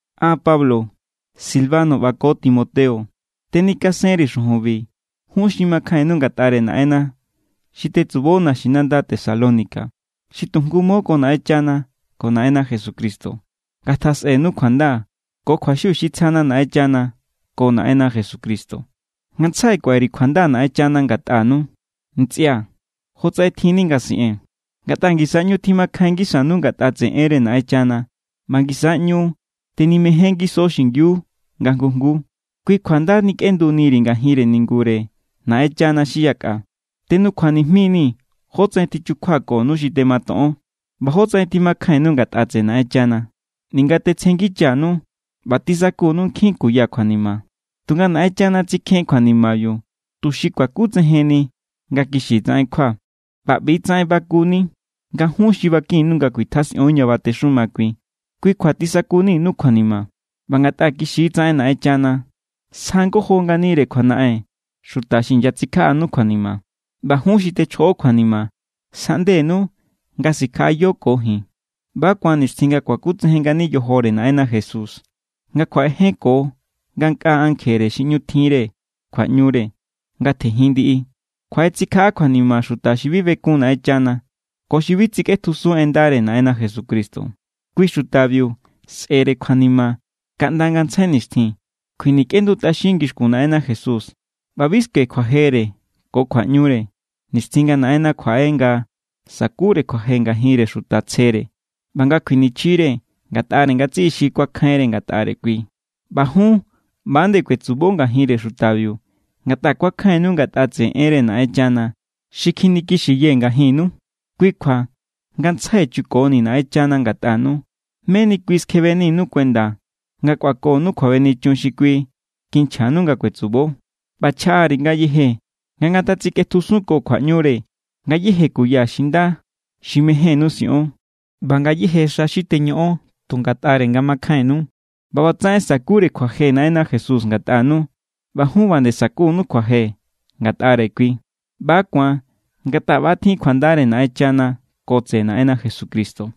An, Pablo, Silvano ꞌba ko Timoteo tenikasenri̱ xujunbi jun xi makjainnu ngatꞌare Naꞌenna xi tetsubo naxinanda Tesalónica, xi tu jngu mo ko Naꞌenchana ko Naꞌenna Jesucristo. Ngatjasꞌenu kjuanda ko kjuaxiu xi tsjana Naꞌenchana ko Naꞌenna Jesucristo. Ngantsjai kuaꞌe_ri̱ kjuanda Naꞌenchana ngatꞌanu, ntsꞌia̱, jotsaꞌen tjinni nga siꞌee̱n, ngatꞌa ngisa= ꞌñu tjimakjain ngisanu ngatꞌa tseꞌe enre Naꞌenchana ꞌba ngisa= ꞌñu tenimejen ngiso xingiu nga jngu jnguu. Kui kjua nda nikꞌenduniri̱ ngajin ningure Naꞌenchana xi yakꞌa. Tenukjuanijmii̱ jótsaꞌen tichukjuakonu xi tematoꞌon ꞌba jótsaꞌen tjimakjainnu ngatꞌa tseꞌe Naꞌenchana, ninga tetsjengichanu ꞌba tisakunu nkjin kuya kjuanima. Tunga Naꞌenchana tsikjen kjuanimabiu tuxi kuakutsejenni nga kixi tsaꞌen kjua. ꞌBa ꞌbi=tsaꞌen bakuni nga jun xi bakinnu nga kuitjasꞌion ña batexuma kui. Kui= kjua tisakuninu kjuanima. ꞌBa ngatꞌa kixi= tsaꞌen Naꞌenchana, sja ngojo nganire kjuanaꞌen xuta xi inyatsikjaꞌanu kjuanima, ꞌba jun xi techjoꞌo kjuanima, sjaꞌndenu nga sikjaꞌayo ko ji̱n. ꞌBa= ku̱an nixtjin nga kuakutsejen ngani yojore Naꞌenna Jesús, nga kjuaꞌejenko ngankꞌaa ankjere xi ꞌñu tjinre kjuaꞌñure nga tjenjin ndiꞌi. Kjuaꞌetsikjaꞌa kjuanima xuta xi bi bekun Naꞌenchana ko xi bi tsikꞌetjusun en ndare Naꞌenna Jesucristo. Kui xutabiu sꞌe̱re kjuanima kaꞌnda ngantsjai nixtjin. Kjuinikꞌendutꞌaxin ngixkun Naꞌenna Jesús. ꞌBa bi skue kjuajere ko kjuaꞌñure nixtjin nga Naꞌenna kjuaꞌe nga sa̱kure kjuaje ngajinre xuta tsjere ꞌba nga kjuinichjire ngatꞌare ngatsiꞌi xi kuakjainre ngatꞌare kui. ꞌBa jun ꞌba=nde kuetsubo ngajinre xutabiu ngatꞌa kuakjainnu ngatꞌa tseꞌe enre Naꞌenchana xi kjinikixiyee̱ ngajinnu. Kui= kjua, ngantsjai chukonii̱ Naꞌenchana ngatꞌanu, meni kui skjebeninu kuenda nga kꞌuakonu kjuabenichun xi kui kinchjanu nga kuetsubo. ꞌBa chjaꞌa_ri̱ ngayeje nga ngatatsikꞌetjusunko kjuaꞌñure ngayéje kuya xi nda xi mejénnu siꞌon ꞌba ngayéje xa xi teñoꞌon tu ngatꞌare nga makjainnu. ꞌBa ꞌbatsaꞌen sa̱kure kjuaje Naꞌenna Jesús ngatꞌanu ꞌba jun ꞌba nde sa̱kunu kjuaje ngatꞌare kui. ꞌBa= ku̱an ngatꞌa ꞌba= tjin kjuandare Naꞌenchana ko tseꞌe Naꞌenna Jesucristo.